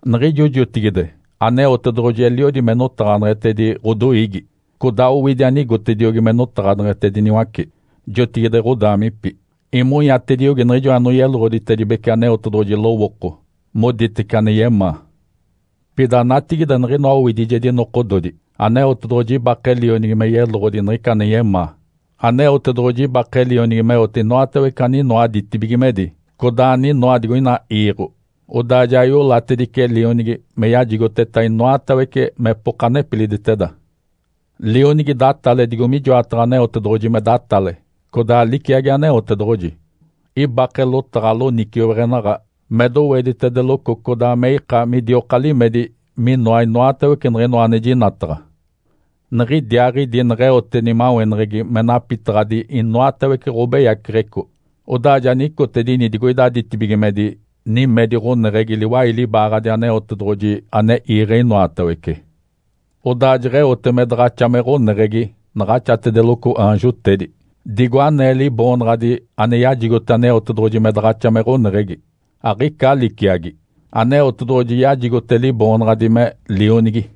Niɡ̶ijo jotigide Aneotedoɡ̶oji eliodi me notaɡ̶aneɡ̶etedi ɡ̶odoiigi, codaa owidi anigotediogi me notaɡ̶aneɡ̶etediniwace jotigide ɡ̶odaamipi. Imonyatediogi niɡ̶ijo anoyeloɡ̶oditedibece Aneotedoɡ̶oji lowooko moditece ane yemaa. Pida natigide, niɡ̶inoa owidijedi nokododi, Aneotedoɡ̶oji ibake Lionigi me yeloɡ̶odi niɡ̶ica ane yemaa. Aneotedoɡ̶oji ibake Lionigi meote inoatawece aninoa ditibigimedi, codaa aninoa digoina iiɡ̶o, odaa ja iolatedice Lionigi me yajigoteta inoatawece mepoka nepiliditeda. Lionigi datale digo mijoataɡ̶a Aneotedoɡ̶oji me datale, codaa liciagi Aneotedoɡ̶oji. Ibake lotaɡ̶a loniciweɡ̶enaɡ̶a me doweditedeloco codaa me ika midioka limedi minoa inoatawece niɡ̶inoa ane jinataɡ̶a. Niɡ̶idiaaɡ̶idi neɡ̶eote nimaweneɡ̶egi me napitaɡ̶adi inoatawece ɡ̶obeyaceɡ̶eco, odaa ja nicotedini digoida ditibigimedi nimedi ɡ̶oneɡ̶egi liwai libaaɡ̶adi Aneotedoɡ̶oji ane iiɡ̶e inoatawece. Odaa jeɡ̶eote me daɡ̶axa me ɡ̶oneɡ̶egi naɡ̶axatedeloco aanjotedi, digo anee Liboonaɡ̶adi ane yajigote Aneotedoɡ̶oji me daɡ̶axa me ɡ̶oneɡ̶egi, aɡ̶ica liciagi. Aneotedoɡ̶oji yajigote Liboonaɡ̶adi me “Lionigi”.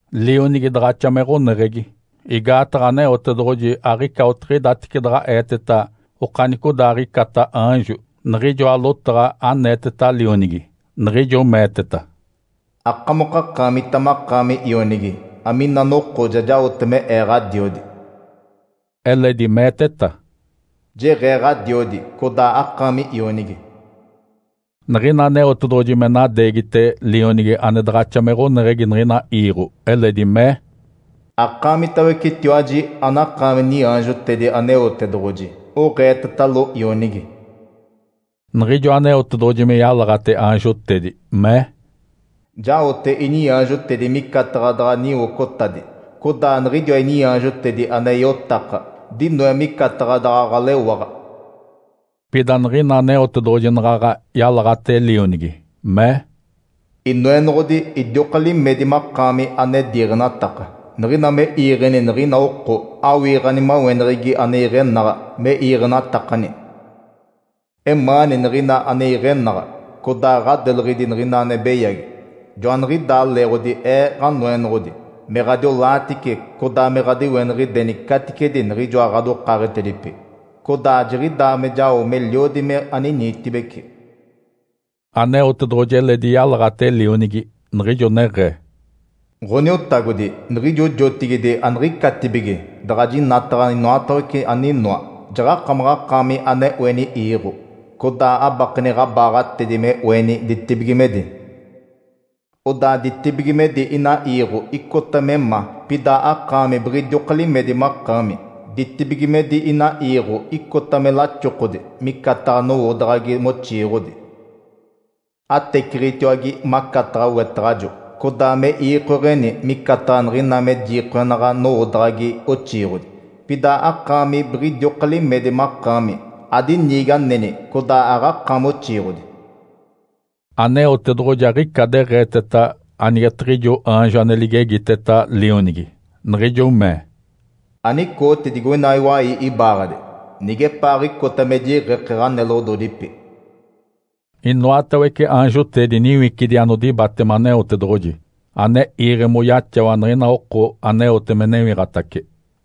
Lionigi daɡ̶axa me ɡ̶oneɡ̶egi, igaataɡ̶a Aneotedoɡ̶oji aɡ̶ica otiɡ̶idatece daɡ̶a eeteta okanicodaaɡ̶icata aanjo niɡ̶ijoa lotaɡ̶a aneeteta Lionigi, niɡ̶ijo meeteta, “Akamokakaamita makaami Ionigi, amina noko ja jaote me Ee Ǥadiodi.” Eledi meeteta, “Jeɡ̶ee Ǥadiodi, codaa akaami Ionigi.” Niɡ̶ina Aneotedoɡ̶oji me nadeegite Lionigi ane daɡ̶axa me ɡ̶oneɡ̶egi niɡ̶ina iiɡ̶o, eledi mee, “Akaamitawecetiwaji anakaami niaanjotedi Aneotedoɡ̶oji oɡ̶eetetalo Ionigi!” Niɡ̶ijo Aneotedoɡ̶oji me yalaɡ̶ate aanjotedi, mee, “Jaote iniaanjotedi micataɡ̶a daɡ̶a niwocotadi, codaa niɡ̶idiwa iniaanjotedi ane iotaka dinoe micataɡ̶a daɡ̶a ɡ̶alewaɡ̶a.” Pida niɡ̶ina Aneotedoɡ̶oji naɡ̶aɡ̶a yalaɡ̶ate Lionigi, mee, “Inoenoɡ̶odi, idioka limedi makaami ane diiɡ̶enataka. Niɡ̶ina me iiɡ̶eni niɡ̶ina oko, awii ɡ̶animaweneɡ̶egi ane iɡ̶enaɡ̶a me iiɡ̶enatakani. Emaani niɡ̶ina ane iɡ̶enaɡ̶a, codaa ɡ̶adeleɡ̶edi niɡ̶ina ane beyagi. Joaniɡ̶idaa leeɡ̶odi Ee, Ǥanoenoɡ̶odi Aneotedoɡ̶oji, me ɡ̶adiolaatice, codaa me ɡ̶adiweniɡ̶ideni caticedi niɡ̶ijoa ɡ̶adokaaɡ̶etedipi, codaa jiɡ̶idaa me jao meliodi me aniniitibeci.” Aneotedoɡ̶oji eledi yalaɡ̶ate Lionigi, niɡ̶ijo neɡ̶ee, “Ǥoniotagodi, niɡ̶ijo jotigide aniɡ̶icatibige daɡ̶a jinataɡ̶a inoatawece aninoa, jaɡ̶akamaɡ̶akaami ane oeni iiɡ̶o, codaa abakeni ɡ̶abaaɡ̶atedi me oeni ditibigimedi. Odaa ditibigimedi inaa iiɡ̶o icota me ma, pida akaami biɡ̶idioka limedi makaami. Ditibigimedi inaa iiɡ̶o icota me laxokodi micataɡ̶a nowoodaɡ̶agi moxiiɡ̶odi. Ateciɡ̶itiwage macataɡ̶a wetaɡ̶ajo, codaa me iikoeɡ̶eni micataɡ̶a niɡ̶ina me jiikoenaɡ̶a nowoodaɡ̶agi oxiiɡ̶odi. Pida akaami biɡ̶idioka limedi makaami, adiniigi aneni, codaa aɡ̶akaami oxiiɡ̶odi.” Aneotedoɡ̶oji aɡ̶ica deɡ̶eeteta anigetiɡ̶ijo aanjo ane ligegiteta Lionigi, niɡ̶ijo mee, “Anicooti digoina iwai ibaaɡ̶adi nigepaaɡ̶icota me jiiɡ̶eke ɡ̶aneloɡ̶ododipi.” Inoatawece aanjotedi niwicidi anodibatema Aneotedoɡ̶oji, ane iiɡ̶e moyaxawa niɡ̶ina oko aneote me newiɡ̶atace.